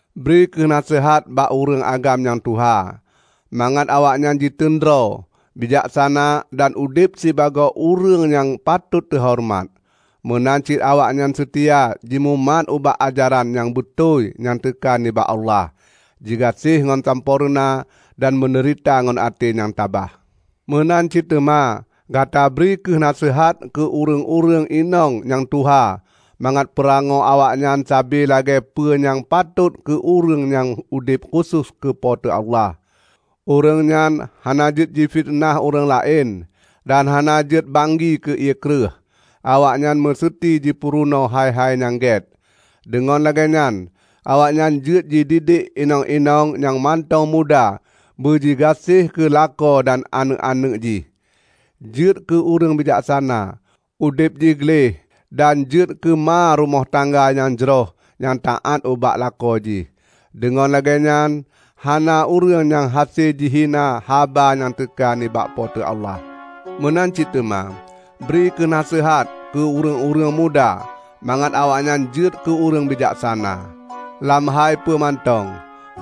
Bri kheueh naseuhat bak ureuëng agam nyang tuha, mangat awaknyan jiteun droe, bijaksana dan udeb sibagoe ureuëng nyang patot teuhoreumat. Meunan cit awaknyan seutia jimumat bak ajaran nyang beutôi nyang teuka nibak Allah, jigaséh ngon sampoereuna dan meudeurita ngon até nyang tabah. Meunan cit teuma gata bri kheueh naseuhat keu ureuëng-ureuëng inong nyang tuha mangat peurangoe awaknyan saban lagée peue nyang patot keu ureuëng nyang udeb khusos keu Po teu Allah. Ureuëng nyan hana jeuet jifiteunah ureuëng laén, dan hana jeuet banggi keu ié kreueh. Awaknyan meuseuti jipeurunoe hai-hai nyang gét, deungon lagée nyan awaknyan jeuet jididek inong-inong nyang mantong muda beujigaséh keu lakoe dan aneuëk-aneuëk jih, jeuet keu ureuëng bijaksana, udeb jih gleh dan jeuet keu ma rumoh tangga nyang jroh nyang taát ubak lakoe jih. Deungon na lagée nyan hana ureuëng nyang hase jihina haba nyang teuka nibak Po teu Allah. Meunan cit teuma, bri kheueh naseuhat keu ureuëng-ureuëng muda mangat awaknyan jeuet keu ureuëng bijaksana. Lam hai peue mantong,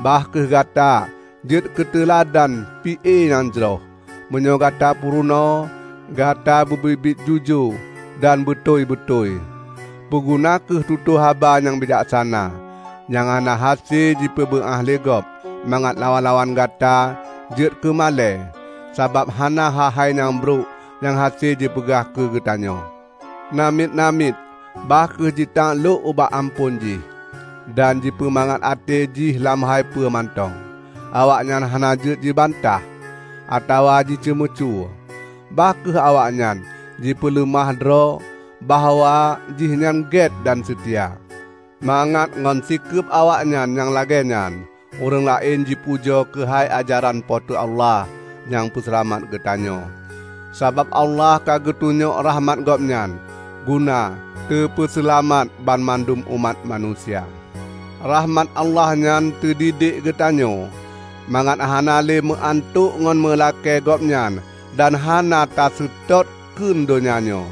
bah kheueh gata jeuet keuteuladan pi-e nyang jroh. Meunyoe gata peurunoe, gata beu biet-biet jujoe dan beutôi-beutôi. Peuguna kheueh tutoe haba nyang bijaksana, nyang hana hase jipeubeuáh lé gob, mangat lawan-lawan gata jeuet keumalée sabab hana hai-hai nyang brok nyang hase jipeugah keugeutanyoe. Namiet-namiet bah kheueh jitaklok ubak amphon jih, dan jipeumangat até jih lam hai peue mantong. Awaknyan hana jeuet jibantah, atawa jiceumeucue. Bah kheueh awaknyan jipeuleumah droe bahwa jihnyan gét dan seutia, mangat ngon sikeueb awaknyan nyang lagée nyan ureuëng laén jipujoe keuhai ajaran Po teu Allah, nyang peuseulamat geutanyoe. Sabab Allah ka geutunyok rahmat Gobnyan guna teupeuseulamat banmandum umat manusia. Rahmat Allah nyan teudidek geutanyoe mangat hana lé meuantok ngon meulakée Gobnyan dan hana taseutôt kheun donya nyoe.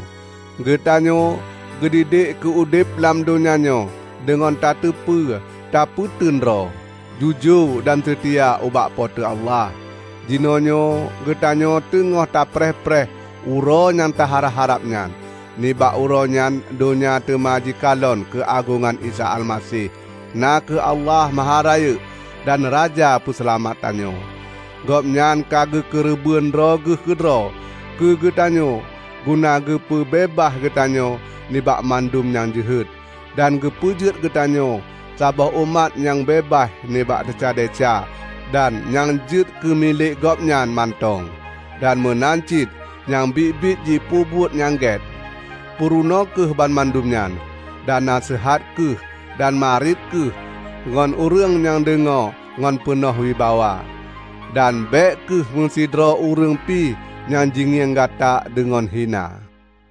Geutanyoe geudidek keu udeb lam donya nyoe deungon tateupeue tapeuteun droe, jujoe dan seutia ubak Po teu Allah. Jinoenyoe geutanyoe teungoh tapreh-preh Uroe nyang taharab-harab nyan; nibak Uroe nyan donya teuma jikalon keuagongan Isa Almaseh, na kheueh Allah Maharayeuk dan Raja Peuseulamat tanyoe. Gobnyan ka geukeureubeuen droe Geuh keudroe keugeutanyoe guna keugeupeu beubaih geutanyoe nibak mandum nyang jeuhet, dan geupeujeuet geutanyoe saboh umat nyang beubaih nibak desya-desya dan nyang jeuet keu milék Gobnyan mantong, dan meunan cit nyang biet-biet jipeubuet nyang gét. Purunoe kheueh banmandum nyan, dan naseuhat kheueh dan marit kheueh ngon ureuëng nyang deungoe ngon peunoh wibawa. Dan bék kheueh meusidroe ureuëng pi nyang jingieng gata deungon hina.